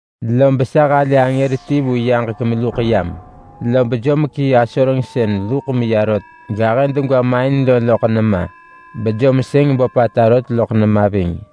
Lob sa halë angër ti vu yaġek meluḳ yam. Lob jom kii asoreng sën luḳ meya rot gahë degwa main lo loḳ nema, bejom sëng böpata rot loḳ nema ving.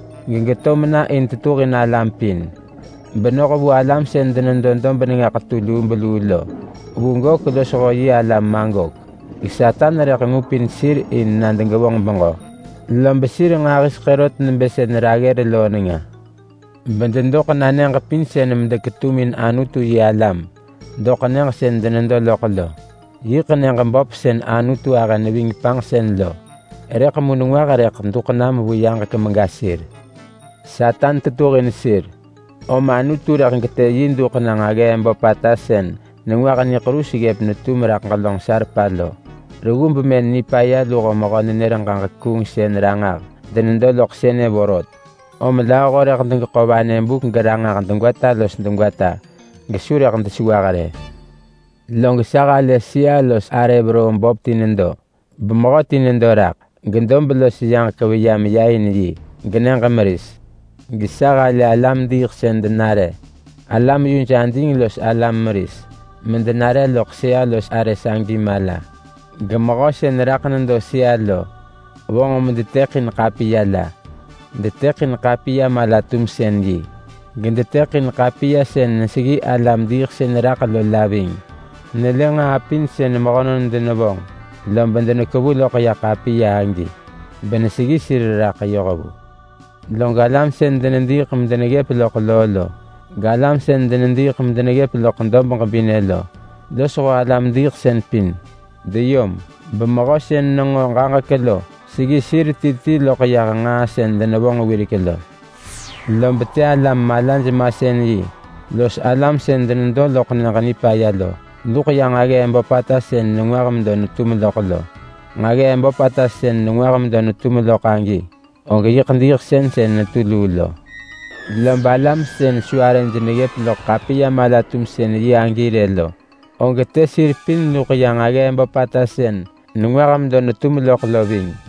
gegeto mena in tetuhin alam pin, benoh vu alam sën denedo dob nenga ḳetu lubeluu lo, vu Gok losho yi alam Magok. Satan rëḳ ngupin sir in na degevonġ beġö, lob sir nġahiseḳë rot nebë sën raggër loo nenga. Bededoḳ na nyëġ pin medeketumin Anutu-yi-alam doḳ nyëġ sën denedo loḳ lo. Yiḳ nyëġ böp sën Anutu ahë neving panġsën lo. Rëḳ mu nengwah rëḳ duḳ nam vu yaġek mega sir. Satan tetuhin sir, om Anutu rëḳ getë yi duḳ na nġaggee böpata sën nengwah niḳerus ggëp netum raḳ ġelönġ salpa lo. Reggu bemën nipaya luho mehö-nenër-ġaġek-kuungsën-ranġah denedo loḳ sënë vorot, om lööho rëḳ degeḳo vanë buk geranġah degwata los degwata gesu rëḳ desewah rë. Log sa halë sëa-los-arë veroo böp ti nedo, bemehöti nedo raḳ. Gedob los yaġek veya meya in yi, genyëġ meris. Gesa halë alam-diiḳsën denare, alam yuj ading los alam meris, medenare loḳ sëa-los-arë sagi mala. Gemehö sën raḳ nedo sëa lo vonġ medetëḳin ḳapiya la. Detëḳin ḳapiya mala-tumsën-yi, gedetëḳin ḳapiya sën neseggi alam-diiḳsën raḳ lo la ving. Nelë nġaa pin sën mehönon denevonġ lob denekevu loḳ ya ḳapiya agi beneseggi sir raḳ yoh vu. Log alam sën denediiḳ medeneggëp luḳ loo lo, galam sën denediiḳ medeneggëp loḳ dob ġebinë lo, losho alam-diiḳsën pin deyom, bemehö sën nenġo ġaġek lo seggi sir ti ti loḳ yah nġaa sën denevonġ wirek lo. Lob të alam malaj-masën-yi los alam sën denedo loḳ Nyëġ Nipaya lo luḳ ya nġaggee böpata sën nengwah medo netum loḳ lo. Nġaggee böpata sën nengwah medo netum loḳ agi, og yiḳ diiḳsën sën netu luu lo. Lob alam sën su arëj neggëp loḳ ḳapiya mala-tumsën-yi agi rë lo, og të sir pin luḳ ya nġaggee böpata sën nengwah medo netum loḳ lo ving.